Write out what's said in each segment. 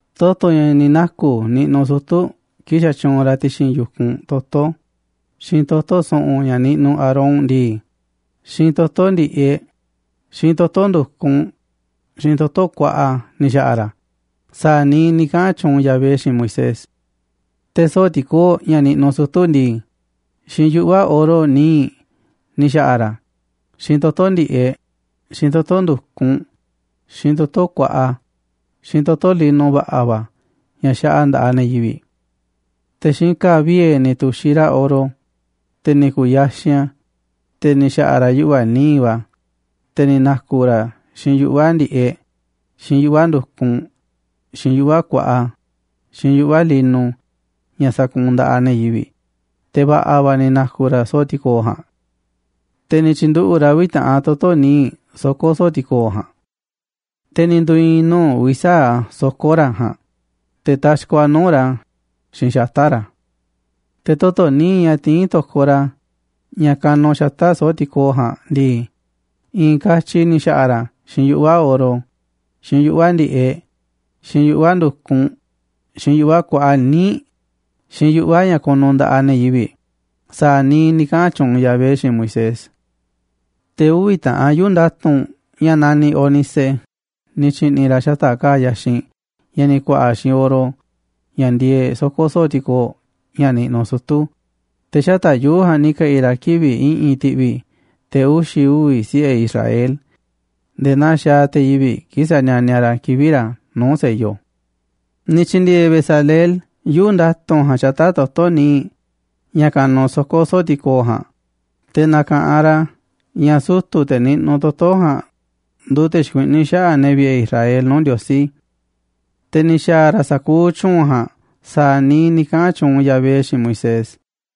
Toto̱ ña̱ ni̱ naku̱ niꞌnuꞌ sutu̱ kii̱ꞌ xatyuunꞌ ra̱ ti̱xi̱n yu̱kunꞌ toto̱, xiinꞌ toto̱ su̱ꞌu̱n ña̱ niꞌnuꞌ Aarón ndii, xiinꞌ toto̱ ndi̱ꞌeꞌ, xiinꞌ toto̱ ndu̱kunꞌ, xiinꞌ toto̱ kuaꞌa ni̱ xa̱ꞌa̱ ra̱ a̱ sa̱a̱ niiꞌ ni̱ kaꞌa̱n tyuunꞌ Yahvé xiinꞌ Moisés. Te̱ soo̱ꞌ tikoo̱ꞌ ña̱ niꞌnuꞌ sutu̱ ndii, xiinꞌ yuꞌva̱ oro nii̱ꞌ ni̱ xa̱ꞌa̱ ra̱ a̱, xiinꞌ toto̱ ndi̱ꞌeꞌ, xiinꞌ toto̱ ndu̱kunꞌ, xiinꞌ toto̱ kuaꞌa, xiinꞌ toto̱ lino va̱ꞌa̱ va̱ ña̱ xaꞌa nda̱ꞌaꞌ ne̱ yivi̱ꞌ. Te̱ xiinꞌ ka̱a̱ vie̱ ni̱ tu̱xiꞌ ra̱ oro, te̱ ni̱ ku̱u̱ yaxinꞌ a̱ te̱ ni̱ xaꞌa̱ꞌ ra̱ yuꞌva̱ nii̱ꞌ va̱, te̱ ni̱ na̱ku̱ ra̱ a̱ xiinꞌ yuꞌva̱ ndi̱ꞌeꞌ, xiinꞌ yuꞌva̱ ndu̱kunꞌ, xiinꞌ yuꞌva̱ kuaꞌa, xiinꞌ yuꞌva̱ lino ña̱ sakuunꞌ nda̱ꞌaꞌ ne̱ yivi̱ꞌ, te̱ va̱ꞌa̱ va̱ ni̱ na̱ku̱ ra̱ soo̱ꞌ ti̱koo̱ꞌ ja̱a̱nꞌ. Te̱ ni̱ tyi̱nduꞌu̱ꞌ ra̱ uvi̱ taꞌan toto̱ níiꞌ soko̱ soo̱ꞌ ti̱kooꞌ ja̱a̱nꞌ, te̱ ni̱ ndu̱i̱i̱n nuu̱ꞌ uvi̱ sa̱aꞌ a̱ soko̱ꞌ ra̱ ja̱a̱nꞌ, te̱ taxkoꞌ a̱ nuu̱ꞌ ra̱ xiinꞌ xata̱ꞌ ra̱. Te̱ toto̱ níiꞌ ña̱ tiín to̱koꞌ ra̱, ña̱ kanuꞌ xata̱ꞌ soo̱ꞌ ti̱koo̱ꞌ ja̱a̱nꞌ ndii, i̱i̱n katyi ni̱ xa̱ꞌa̱ ra̱ xiinꞌ yuꞌva̱ oro, xiinꞌ yuꞌva̱ ndi̱ꞌeꞌ, xiinꞌ yuꞌva̱ ndu̱kunꞌ, xiinꞌ yuꞌva̱ kuaꞌa níiꞌ, xiinꞌ yuꞌva̱ ña̱ kunu nda̱ꞌaꞌ ne̱ yivi̱ꞌ sa̱a̱ niiꞌ ni̱ kaꞌa̱n tyuunꞌ Yahvé xiinꞌ Moisés. Te̱ uvi̱ ta̱ꞌanꞌ yuu̱ꞌ nda̱tu̱nꞌ ña̱ naniꞌ ónice ni̱ tyi̱ꞌni̱ ra̱ xata̱ꞌ ka̱a̱ yaxinꞌ ña̱ ni̱ ku̱a̱ꞌa̱ xiinꞌ oro ña̱ ndieeꞌ soko̱ soo̱ꞌ ti̱koo̱ꞌ ña̱ niꞌnuꞌ sutu̱, te̱ xata̱ꞌ yuu̱ꞌ ja̱a̱nꞌ ni̱ ke̱ꞌi̱ ra̱ kivi̱ꞌ i̱ꞌi̱n ti̱ꞌvi̱ te̱ uxi̱ uvi̱ siꞌe̱ Israel nde̱e̱ naa xaaꞌ te̱ yivi̱ꞌ kii̱ꞌ sanianiaꞌ ra̱ kivi̱ꞌ ra̱ nuu̱ꞌ sello. Ni̱ tyi̱ndi̱e̱e̱ Bezaleel yuu̱ꞌ nda̱tu̱nꞌ ja̱a̱nꞌ xata̱ꞌ toto̱ nii̱ꞌ ña̱ kanuꞌ soko̱ soo̱ꞌ ti̱koo̱ꞌ ja̱a̱nꞌ, te̱ na̱ka̱ꞌanꞌ ra̱ ña̱ sutu̱, te̱ niꞌnuꞌ toto̱ ja̱a̱nꞌ nduuꞌ te̱ xikuiꞌní xaꞌa̱ꞌ ne̱ vi̱ꞌe̱ Israel nuu̱ꞌ Ndiosí. Te̱ ni̱ xa̱a̱ ra̱ sa̱kuuꞌ tyu̱u̱n ja̱a̱nꞌ sa̱a̱ niiꞌ ni̱ kaꞌa̱n tyuunꞌ Yahvé xiinꞌ Moisés.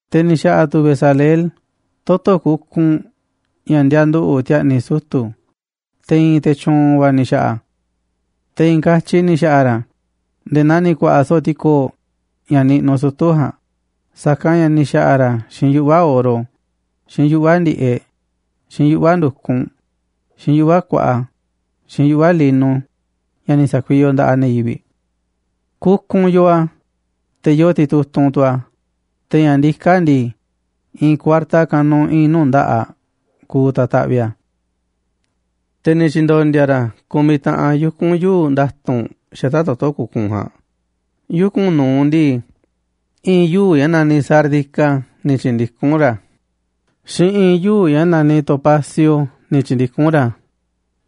Te̱ ni̱ xa̱ꞌa̱ tu̱ Bezaleel toto̱ kukunꞌ ña̱ ndianduꞌu̱ꞌ ti̱a̱ꞌni̱ sutu̱ꞌ te̱ i̱i̱n te̱ tyu̱u̱n va̱ ni̱ xa̱ꞌa̱ a̱. Te̱ i̱i̱n katyi ni̱ xa̱ꞌa̱ ra̱ a̱ nde̱e̱ naa ni̱ ku̱a̱ꞌa̱ soo̱ꞌ ti̱koo̱ꞌ ña̱ niꞌnuꞌ sutu̱ ja̱a̱nꞌ, sa̱kanꞌ ña̱ ni̱ xa̱ꞌa̱ ra̱ xiinꞌ yuꞌva̱ oro, xiinꞌ yuꞌva̱ ndi̱ꞌeꞌ, xiinꞌ yuꞌva̱ ndu̱kunꞌ, xiinꞌ yuꞌva̱ kuaꞌa, xiinꞌ yuꞌva̱ lino ña̱ ni̱ sa̱kuiyoꞌ nda̱ꞌaꞌ ne̱ yivi̱ꞌ. Kukunꞌ yoo a̱, te̱ yoo titutunꞌ tu̱ a̱, te̱ ña̱ ndiká a̱ ndii, i̱i̱n kuarta kanuꞌ i̱i̱n nuu̱ꞌ nda̱ꞌaꞌ kuuꞌ ta̱taꞌviꞌ a̱. Te̱ ni̱ tyi̱ndo̱ndi̱a̱ ra̱ ku̱miꞌ taꞌan yuku̱n yuu̱ꞌ nda̱tu̱nꞌ xata̱ꞌ toto̱ kukunꞌ ja̱a̱nꞌ. Yuku̱n nu̱uꞌ ndii, i̱i̱n yuu̱ꞌ ña̱ naniꞌ sárdica ni̱ tyi̱ndikún ra̱, xiinꞌ i̱i̱n yuu̱ꞌ ña̱ naniꞌ topacio ni̱ tyi̱ndikún ra̱,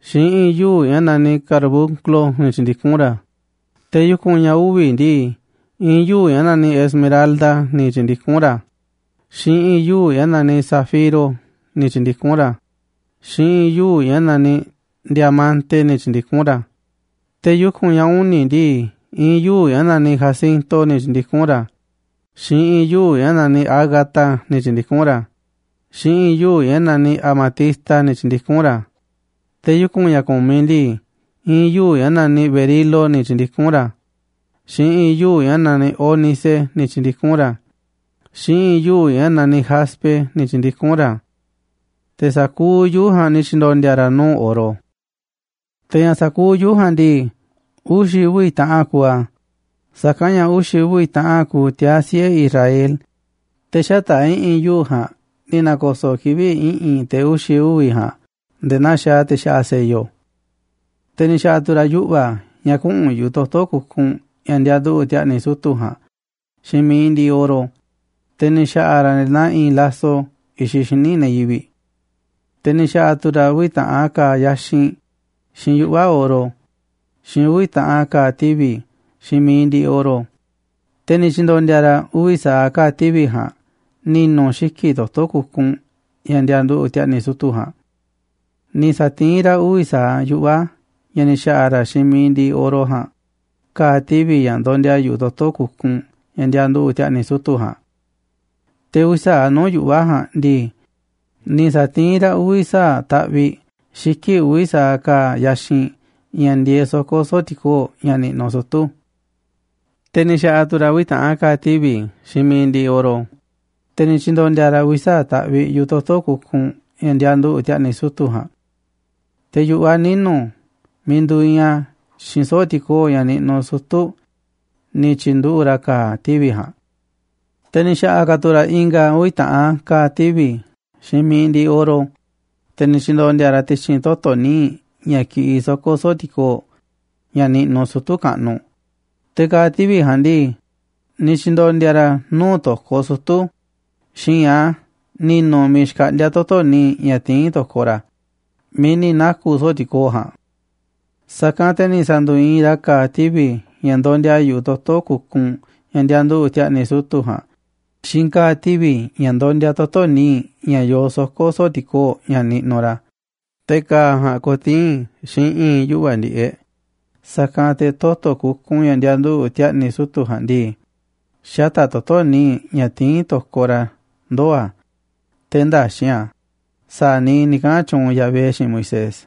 xiinꞌ i̱i̱n yuu̱ꞌ ña̱ naniꞌ carbunclo ni̱ tyi̱ndikún ra̱. Te̱ yuku̱n ña̱ uvi̱ ndii, i̱i̱n yuu̱ꞌ ña̱ naniꞌ esmeralda ni̱ tyi̱ndikún ra̱, xiinꞌ i̱i̱n yuu̱ꞌ ña̱ naniꞌ zafiro ni̱ tyi̱ndikún ra̱, xiinꞌ i̱i̱n yuu̱ꞌ ña̱ naniꞌ diamante ni̱ tyi̱ndikún ra̱. Te̱ yuku̱n ña̱ uni̱ ndii, i̱i̱n yuu̱ꞌ ña̱ naniꞌ jacinto, ni̱ tyi̱ndikún ra̱, xiinꞌ i̱i̱n yuu̱ꞌ ña̱ naniꞌ ágata ni̱ tyi̱ndikún ra̱, xiinꞌ i̱i̱n yuu̱ꞌ ña̱ naniꞌ amatista ni̱ tyi̱ndikún ra̱. Te̱ yuku̱n ña̱ ku̱miꞌ ndii, i̱i̱n yuu̱ꞌ ña̱ naniꞌ berilo ni̱ tyi̱ndikún ra̱, xiinꞌ i̱i̱n yuu̱ꞌ ña̱ naniꞌ ónice ni̱ tyi̱ndikún ra̱, xiinꞌ i̱i̱n yuu̱ꞌ ña̱ naniꞌ jaspe ni̱ tyi̱ndikún ra̱. Te̱ sa̱kuuꞌ yuu̱ꞌ ja̱a̱nꞌ ni̱ tyi̱ndo̱ndi̱a̱ ra̱ nuu̱ꞌ oro. Te̱ ña̱ sa̱kuuꞌ yuu̱ꞌ ja̱a̱nꞌ ndii, uxi̱ uvi̱ taꞌan kuuꞌ a̱, sa̱kanꞌ ña̱ uxi̱ uvi̱ taꞌan kuuꞌ tiaa̱ siꞌe̱ Israel, te̱ xata̱ꞌ i̱ꞌi̱n yuu̱ꞌ ja̱a̱nꞌ ni̱ na̱ko̱so̱ꞌ kivi̱ꞌ i̱ꞌi̱n te̱ uxi̱ uvi̱ ja̱a̱nꞌ nde̱e̱ naa xaaꞌ te̱ xaꞌa sello. Te̱ ni̱ xa̱ꞌa̱ tu̱ ra̱ yuꞌva̱ ña̱ kuꞌu̱n yu̱ꞌuꞌ toto̱ kukunꞌ ña̱ ndianduꞌu̱ꞌ ti̱a̱ꞌni̱ sutu̱ꞌ ja̱a̱nꞌ xiinꞌ mi̱iꞌ ndiꞌiꞌ oro, te̱ ni̱ xa̱ꞌa̱ ra̱ a̱ nde̱e̱ naa iinꞌ laso i̱xiꞌ xíniꞌ ne̱ yivi̱ꞌ. Te̱ ni̱ xa̱ꞌa̱ tu̱ ra̱ uvi̱ ta̱ꞌan ka̱a̱ yaxinꞌ xiinꞌ yuꞌva̱ oro xiinꞌ uvi̱ taꞌan ka̱a̱ tivi̱ xiinꞌ mi̱iꞌ ndiꞌiꞌ oro, te̱ ni̱ tyi̱ndo̱ndi̱a̱ ra̱ uvi̱ sa̱aꞌ ka̱a̱ tivi̱ ja̱a̱nꞌ ni̱nu̱ xiki̱ꞌ toto̱ kukunꞌ ña̱ ndianduꞌu̱ꞌ ti̱a̱ꞌni̱ sutu̱ꞌ ja̱a̱nꞌ. Ni̱ sa̱tiín ra̱ uvi̱ sa̱aꞌ yuꞌva̱ ña̱ ni̱ xa̱ꞌa̱ ra̱ xiinꞌ mi̱iꞌ ndiꞌiꞌ oro ja̱a̱nꞌ ka̱a̱ tivi̱ ña̱ ndondia yu̱ꞌuꞌ toto̱ kukunꞌ ña̱ ndianduꞌu̱ꞌ ti̱a̱ꞌni̱ sutu̱ꞌ ja̱a̱nꞌ. Te̱ uvi̱ sa̱aꞌ nuu̱ꞌ yuꞌva̱ ja̱a̱nꞌ ndii, ni̱ sa̱tiín ra̱ uvi̱ sa̱aꞌ taꞌviꞌ xiki̱ꞌ uvi̱ sa̱aꞌ ka̱a̱ yaxinꞌ ña̱ ndieeꞌ soko̱ soo̱ꞌ ti̱koo̱ꞌ ña̱ niꞌnuꞌ sutu̱. Te̱ ni̱ xa̱ꞌa̱ tu̱ ra̱ uvi̱ taꞌan ka̱a̱ tivi̱ xiinꞌ mi̱iꞌ ndiꞌiꞌ oro, te̱ ni̱ tyi̱ndo̱ndi̱a̱ ra̱ a̱ uvi̱ sa̱aꞌ taꞌviꞌ yu̱ꞌuꞌ toto̱ kukunꞌ ña̱ ndianduꞌu̱ꞌ ti̱a̱ꞌni̱ sutu̱ꞌ ja̱a̱nꞌ. Te̱ yu̱ꞌuꞌ a̱ ninu̱ miiꞌ nduuꞌ iinꞌ a̱ xiinꞌ soo̱ꞌ ti̱koo̱ꞌ ña̱ niꞌnuꞌ sutu̱ ni̱ tyi̱nduꞌu̱ꞌ ra̱ ka̱a̱ tivi̱ ja̱a̱nꞌ. Te̱ ni̱ xa̱ꞌa̱ ka̱ tu̱ ra̱ i̱nga̱ uvi̱ taꞌan ka̱a̱ tivi̱ xiinꞌ mi̱iꞌ ndiꞌiꞌ oro, te̱ ni̱ tyi̱ndo̱ndi̱a̱ ra̱ a̱ ti̱xi̱n toto̱ nii̱ꞌ ña̱ kiꞌiꞌ soo̱ꞌ ti̱koo̱ꞌ ña̱ niꞌnuꞌ sutu̱ kaꞌnuꞌ, te̱ ka̱a̱ tivi̱ ja̱a̱nꞌ ndii, ni̱ tyi̱ndo̱ndi̱a̱ ra̱ a̱ nuu̱ꞌ to̱koꞌ sutu̱ xi̱i̱nꞌ a̱ ni̱nu̱ miiꞌ xkaꞌndíá toto̱ níiꞌ ña̱ tiín to̱koꞌ ra̱ miiꞌ ni̱ naku̱ soo̱ꞌ ti̱koo̱ꞌ ja̱a̱nꞌ. Sa̱kanꞌ te̱ ni̱ sa̱ndu̱i̱i̱n ra̱ ka̱a̱ tivi̱ ña̱ ndondia yu̱ꞌuꞌ toto̱ kukunꞌ ña̱ ndianduꞌu̱ꞌ ti̱a̱ꞌni̱ sutu̱ꞌ ja̱a̱nꞌ xiinꞌ ka̱a̱ tivi̱ ña̱ ndondia toto̱ nii̱ꞌ ña̱ yoo soko̱ soo̱ꞌ ti̱koo̱ꞌ ña̱ niꞌnuꞌ ra̱, te̱ ka̱a̱ ja̱a̱nꞌ ko̱tii̱n xiinꞌ i̱i̱n yuꞌva̱ ndi̱ꞌeꞌ, sa̱kanꞌ te̱ toto̱ kukunꞌ ña̱ ndianduꞌu̱ꞌ ti̱a̱ꞌni̱ sutu̱ꞌ ja̱a̱nꞌ ndii, xata̱ꞌ toto̱ nii̱ꞌ ña̱ tiín to̱koꞌ ra̱ ndoo̱ a̱ te̱ ndäxi̱nꞌ a̱ sa̱a̱ niiꞌ ni̱ kaꞌa̱n tyuunꞌ Yahvé xiinꞌ Moisés.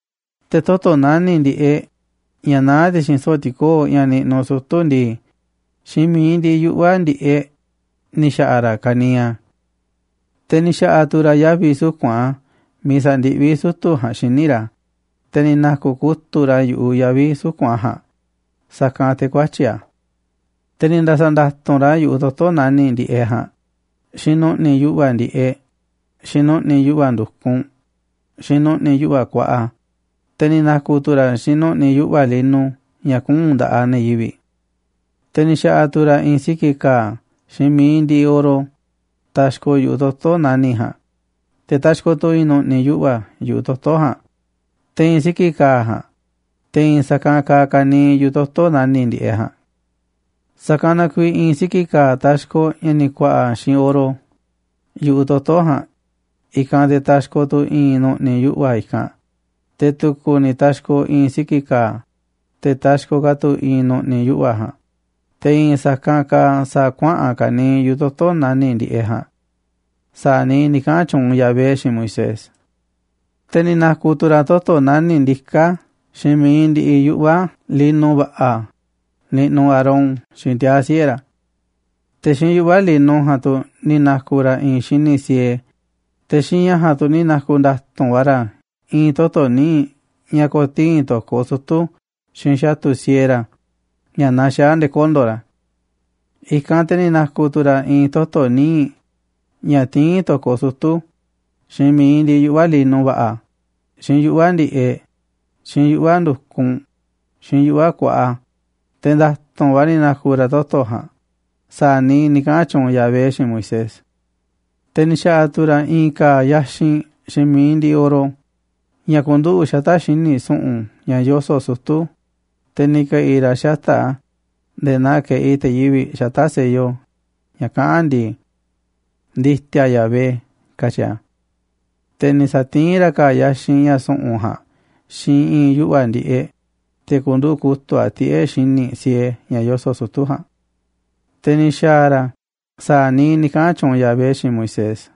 Te̱ toto̱ nani̱ꞌ ndi̱ꞌeꞌ, ña̱ naá ti̱xi̱n soo̱ꞌ ti̱koo̱ꞌ ña̱ niꞌnuꞌ sutu̱ ndii, xiinꞌ mi̱iꞌ ndiꞌiꞌ yuꞌva̱ ndi̱ꞌeꞌ ni̱ xa̱ꞌa̱ ra̱ ka̱niiꞌ a̱. Te̱ ni̱ xa̱ꞌa̱ tu̱ ra̱ yavi̱ suku̱nꞌ a̱ miiꞌ sa̱ndiꞌví sutu̱ ja̱a̱nꞌ xíniꞌ ra̱, te̱ ni̱ na̱ku̱ kutu̱ꞌ ra̱ yu̱ꞌuꞌ yavi̱ suku̱nꞌ a̱ ja̱a̱nꞌ, sa̱kanꞌ te̱ ku̱ä̱tyi̱ a̱. Te̱ ni̱ nda̱sa̱nda̱tu̱nꞌ ra̱ yu̱ꞌuꞌ toto̱ nani̱ꞌ ndi̱ꞌeꞌ ja̱a̱nꞌ xiinꞌ nu̱ꞌni̱ yuꞌva̱ ndi̱ꞌeꞌ, xiinꞌ nu̱ꞌni̱ yuꞌva̱ ndu̱kunꞌ, xiinꞌ nu̱ꞌni̱ yuꞌva̱ kuaꞌa, te̱ ni̱ na̱ku̱ tu̱ ra̱ xiinꞌ nu̱ꞌni̱ yuꞌva̱ lino ña̱ kuu̱nꞌ nda̱ꞌaꞌ ne̱ yivi̱ꞌ. Te̱ ni̱ xa̱ꞌa̱ tu̱ ra̱ i̱i̱n siki̱ ka̱a̱ xiinꞌ mi̱iꞌ ndiꞌiꞌ oro taxkoꞌ yu̱ꞌuꞌ toto̱ nani̱ꞌ ja̱a̱nꞌ, te̱ taxkoꞌ tu̱ i̱i̱n nu̱ꞌni̱ yuꞌva̱ yu̱ꞌuꞌ toto̱ ja̱a̱nꞌ te̱i̱n siki̱ ka̱a̱ ja̱a̱nꞌ, te̱ i̱i̱n sa̱kanꞌ kaaꞌ ka̱niiꞌ yu̱ꞌuꞌ toto̱ nani̱ꞌ ndi̱ꞌeꞌ ja̱a̱nꞌ. Sa̱kanꞌ na kuiiꞌ i̱i̱n siki̱ ka̱a̱ taxkoꞌ ña̱ ni̱ ku̱a̱ꞌa̱ xiinꞌ oro yu̱ꞌuꞌ toto̱ ja̱a̱nꞌ, i̱kanꞌ te̱ taxkoꞌ tu̱ i̱i̱n nu̱ꞌni̱ yuꞌva̱ i̱kanꞌ, te̱ tu̱ku̱ ni̱ taxkoꞌ i̱i̱n siki̱ ka̱a̱, te̱ taxkoꞌ ka̱ tu̱ i̱i̱n nu̱ꞌni̱ yuꞌva̱ ja̱a̱nꞌ, te̱ i̱i̱n sa̱kanꞌ kaaꞌ sa̱a̱ kuaꞌa̱n ka̱niiꞌ yu̱ꞌuꞌ toto̱ nani̱ꞌ ndi̱ꞌeꞌ ja̱a̱nꞌ sa̱a̱ niiꞌ ni̱ kaꞌa̱n tyuunꞌ Yahvé xiinꞌ Moisés. Te̱ ni̱ na̱ku̱ tu̱ ra̱ toto̱ nani̱ꞌ ndiká xiinꞌ mi̱iꞌ ndiꞌiꞌ yuꞌva̱ lino va̱ꞌa̱ niꞌnuꞌ Aarón xiinꞌ tiaa̱ siꞌe̱ ra̱. Te̱ xiinꞌ yuꞌva̱ lino ja̱a̱nꞌ tu̱ ni̱ na̱ku̱ ra̱ i̱i̱n xíniꞌ siee, te̱ xiinꞌ ña̱ ja̱a̱nꞌ tu̱ ni̱ na̱ku̱ nda̱tu̱nꞌ va̱ ra̱ i̱i̱n toto̱ níiꞌ ña̱ ko̱tii̱n to̱koꞌ sutu̱ xiinꞌ xa̱tu̱ siee ra̱ ña̱ naxaá nde̱e̱ kondo̱ ra̱. I̱kanꞌ te̱ ni̱ na̱ku̱ tu̱ ra̱ i̱i̱n toto̱ nii̱ꞌ ña̱ tiín to̱koꞌ sutu̱ xiinꞌ mi̱iꞌ ndiꞌiꞌ yuꞌva̱ lino va̱ꞌa̱, xiinꞌ yuꞌva̱ ndi̱ꞌeꞌ, xiinꞌ yuꞌva̱ ndu̱kunꞌ, xiinꞌ yuꞌva̱ kuaꞌa, te̱ nda̱tu̱nꞌ va̱ ni̱ na̱ku̱ ra̱ toto̱ ja̱a̱nꞌ sa̱a̱ niiꞌ ni̱ kaꞌa̱n tyuunꞌ Yahvé xiinꞌ Moisés. Te̱ ni̱ xa̱ꞌa̱ tu̱ ra̱ i̱i̱n ka̱a̱ yaxinꞌ xiinꞌ mi̱iꞌ ndiꞌiꞌ oro ña̱ ku̱nduꞌu̱ꞌ xata̱ꞌ xíniꞌ su̱ꞌu̱n ña̱ yoso̱ꞌ sutu̱, te̱ ni̱ ke̱ꞌi̱ ra̱ xata̱ꞌ a̱ nde̱e̱ naa keꞌi te̱ yivi̱ꞌ xata̱ꞌ sello ña̱ kaꞌán ndii: NDI̱TI̱A YAHVÉ, katyi a̱. Te̱ ni̱ sa̱tiín ra̱ ka̱a̱ yaxinꞌ ña̱ su̱ꞌu̱n ja̱a̱nꞌ xiinꞌ i̱i̱n yuꞌva̱ ndi̱ꞌeꞌ, te̱ ku̱nduꞌu̱ꞌ kutu̱ꞌ a̱ tiꞌe̱ xíniꞌ siee ña̱ yoso̱ꞌ sutu̱ ja̱a̱nꞌ. Te̱ ni̱ xa̱a̱ ra̱ sa̱a̱ niiꞌ ni̱ kaꞌa̱n tyuunꞌ Yahvé xiinꞌ Moisés.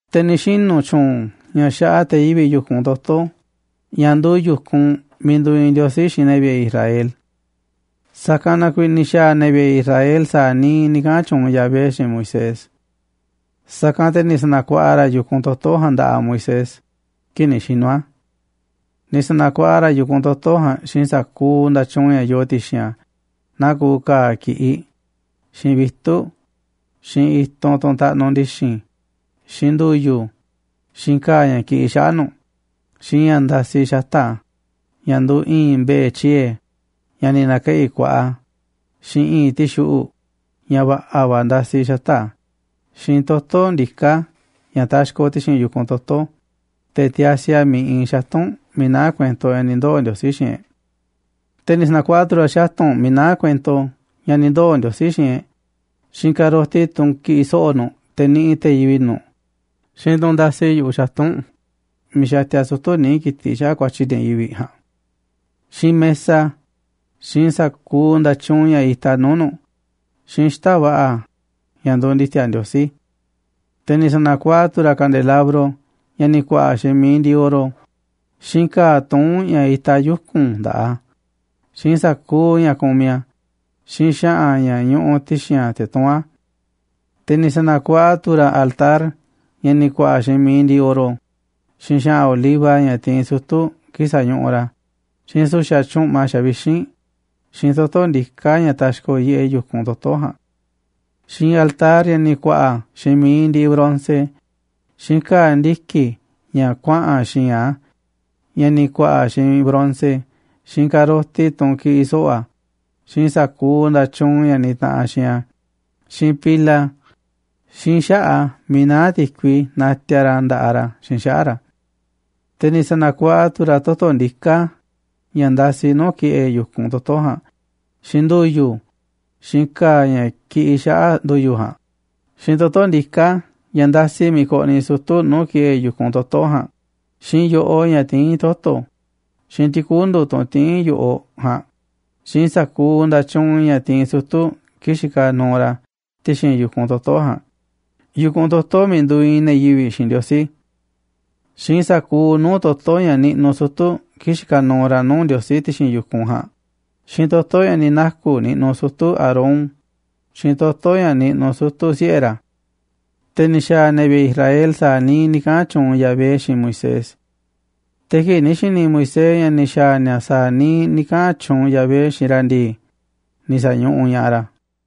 Te̱ ni̱ xinu̱ tyu̱u̱n ña̱ xaꞌa te̱ yivi̱ꞌ yu̱kunꞌ toto̱ ña̱ nduuꞌ yu̱kunꞌ miiꞌ nduuꞌ iinꞌ Ndiosi xiinꞌ ne̱ vi̱ꞌe̱ Israel. Sa̱kanꞌ na kuiiꞌ ni̱ xa̱a̱ ne̱ vi̱ꞌe̱ Israel sa̱a̱ niiꞌ ni̱ kaꞌa̱n tyuunꞌ Yahvé xiinꞌ Moisés. Sa̱kanꞌ te̱ ni̱ sa̱na̱kuaꞌa ra̱ yu̱kunꞌ toto̱ ja̱a̱nꞌ nda̱ꞌaꞌ Moisés kii̱ꞌ ni̱ xinu̱ a̱. Ni̱ sa̱na̱kuaꞌa ra̱ yu̱kunꞌ toto̱ ja̱a̱nꞌ xiinꞌ sa̱kuuꞌ nda̱tyuunꞌ ña̱ yoo ti̱xi̱n a̱, naa kuuꞌ ka̱a̱ ki̱ꞌiꞌ, xiinꞌ vitu̱ꞌ, xiinꞌ i̱tunꞌ, tunꞌ taꞌnuꞌ ndi̱xi̱n, xiinꞌ ndu̱yu̱, xiinꞌ ka̱a̱ ña̱ kiꞌiꞌ xaꞌa̱ꞌ nu̱ꞌ, xiinꞌ ña̱ ndasi xata̱ꞌ a̱, ña̱ nduuꞌ i̱i̱nꞌ mbe̱e̱ tyiee̱, ña̱ ni̱ na̱keꞌi̱ kuaꞌa, xiinꞌ i̱i̱nꞌ ti̱xuꞌu̱ꞌ, ña̱ va̱ꞌa̱ va̱ ndasi xata̱ꞌ a̱, xiinꞌ toto̱ ndiká ña̱ taxkoꞌ ti̱xi̱n yu̱kun toto̱ꞌ, te̱ tiasi a̱ miiꞌ iinꞌ xatu̱nꞌ miiꞌ naá kuento ña̱ ni̱ ndoo̱ Ndiosí xiinꞌ e̱ꞌ. Te̱ ni̱ sa̱na̱kuaꞌa tu̱ ra̱ xatu̱nꞌ miiꞌ naá kuento ña̱ ni̱ ndoo̱ Ndiosí xiinꞌ e̱ꞌ, xiinꞌ ka̱roti, tunꞌ kiꞌiꞌ so̱ꞌo̱ nu̱ꞌ te̱ niꞌiꞌ te̱ yivi̱ꞌ nu̱ꞌ, xiinꞌ tunꞌ ndasi yu̱ꞌuꞌ xatu̱nꞌ miiꞌ xatia sutu̱ níiꞌ ki̱tiꞌ xaꞌa̱ꞌ ku̱a̱tyi̱ ne̱ yivi̱ꞌ ja̱a̱nꞌ, xiinꞌ mesa, xiinꞌ sa̱kuuꞌ nda̱tyuunꞌ ña̱ itaꞌ nuu̱ꞌ nu̱ꞌ, xiinꞌ xita̱ꞌ va̱ꞌa̱ ña̱ nduuꞌ ndi̱ti̱a̱ Ndiosí. Te̱ ni̱ sa̱na̱kuaꞌa tu̱ ra̱ kandelabro ña̱ ni̱ ku̱a̱ꞌa̱ xiinꞌ mi̱iꞌ ndiꞌiꞌ oro, xiinꞌ ka̱a̱ tuún ña̱ itaꞌ yuku̱n nda̱ꞌaꞌ a̱, xiinꞌ sa̱kuuꞌ ña̱ kumiꞌ a̱, xiinꞌ xa̱ꞌa̱n ña̱ ñuꞌuꞌ ti̱xi̱n a̱ te̱ tuún a̱. Te̱ ni̱ sa̱na̱kuaꞌa tu̱ ra̱ altar ña̱ ni̱ ku̱a̱ꞌa̱ xiinꞌ mi̱iꞌ ndiꞌiꞌ oro, xiinꞌ xa̱ꞌa̱n oliva ña̱ tiinꞌ sutu̱ kii̱ꞌ sañuꞌuꞌ ra̱, xiinꞌ su̱xa̱ tyu̱ꞌma xavixínꞌ, xiinꞌ toto̱ ndiká ña̱ taxkoꞌ yiꞌeꞌ yu̱kunꞌ toto̱ ja̱a̱nꞌ, xiinꞌ altar ña̱ ni̱ ku̱a̱ꞌa̱ xiinꞌ mi̱iꞌ ndiꞌiꞌ bronce, xiinꞌ ka̱a̱ ndiki̱ ña̱ kuaꞌa̱n xi̱i̱nꞌ a̱, ña̱ ni̱ ku̱a̱ꞌa̱ xiinꞌ bronce, xiinꞌ ka̱roti, tunꞌ kiꞌiꞌ so̱ꞌo̱ a̱, xiinꞌ sa̱kuuꞌ nda̱tyuunꞌ ña̱ nitaꞌanꞌ xiinꞌ a̱, xiinꞌ pila, xiinꞌ xaꞌa̱ꞌ a̱ miiꞌ naá ti̱kui natiaꞌ ra̱ nda̱ꞌaꞌ ra̱ xiinꞌ xaꞌa̱ꞌ ra̱. Te̱ ni̱ sa̱na̱kuaꞌa tu̱ ra̱ toto̱ ndiká ña̱ ndasi nuu̱ꞌ ki̱ꞌe̱ yu̱kunꞌ toto̱ ja̱a̱nꞌ, xiinꞌ ndu̱yu̱, xiinꞌ ka̱a̱ ña̱ kiꞌiꞌ xaꞌa̱ꞌ ndu̱yu̱ ja̱a̱nꞌ, xiinꞌ toto̱ ndiká ña̱ ndasi miiꞌ koꞌniꞌ sutu̱ nuu̱ꞌ ki̱ꞌe̱ yu̱kunꞌ toto̱ ja̱a̱nꞌ, xiinꞌ yo̱ꞌoꞌ ña̱ tiín toto̱, xiinꞌ ti̱kundu̱, tunꞌ tiín yo̱ꞌoꞌ ja̱a̱nꞌ, xiinꞌ sa̱kuuꞌ nda̱tyuunꞌ ña̱ tiinꞌ sutu̱ kii̱ꞌ xikaꞌ nuuꞌ ra̱ ti̱xi̱n yu̱kunꞌ toto̱ ja̱a̱nꞌ, yu̱kunꞌ toto̱ miiꞌ nduuꞌ iinꞌ ne̱ yivi̱ꞌ xiinꞌ Ndiosí, xiinꞌ sa̱kuuꞌ nuu̱ꞌ toto̱ ña̱ niꞌnuꞌ sutu̱ kii̱ꞌ xikaꞌ nuuꞌ ra̱ nuu̱ꞌ Ndiosí ti̱xi̱n yu̱kunꞌ ja̱a̱nꞌ, xiinꞌ toto̱ ña̱ ni̱ naku̱ niꞌnuꞌ sutu̱ Aarón, xiinꞌ toto̱ ña̱ niꞌnuꞌ sutu̱ siꞌe̱ ra̱. Te̱ ni̱ xa̱a̱ ne̱ vi̱ꞌe̱ Israel sa̱a̱ niiꞌ ni̱ kaꞌa̱n tyuunꞌ Yahvé xiinꞌ Moisés. Te̱ kii̱ꞌ ni̱ xi̱ni̱ Moisés ña̱ ni̱ xa̱a̱ ni̱a̱ sa̱a̱ niiꞌ ni̱ kaꞌa̱n tyuunꞌ Yahvé xiinꞌ ra̱ ndii, ni̱ sa̱ñuꞌuꞌ ña̱ꞌaꞌ ra̱.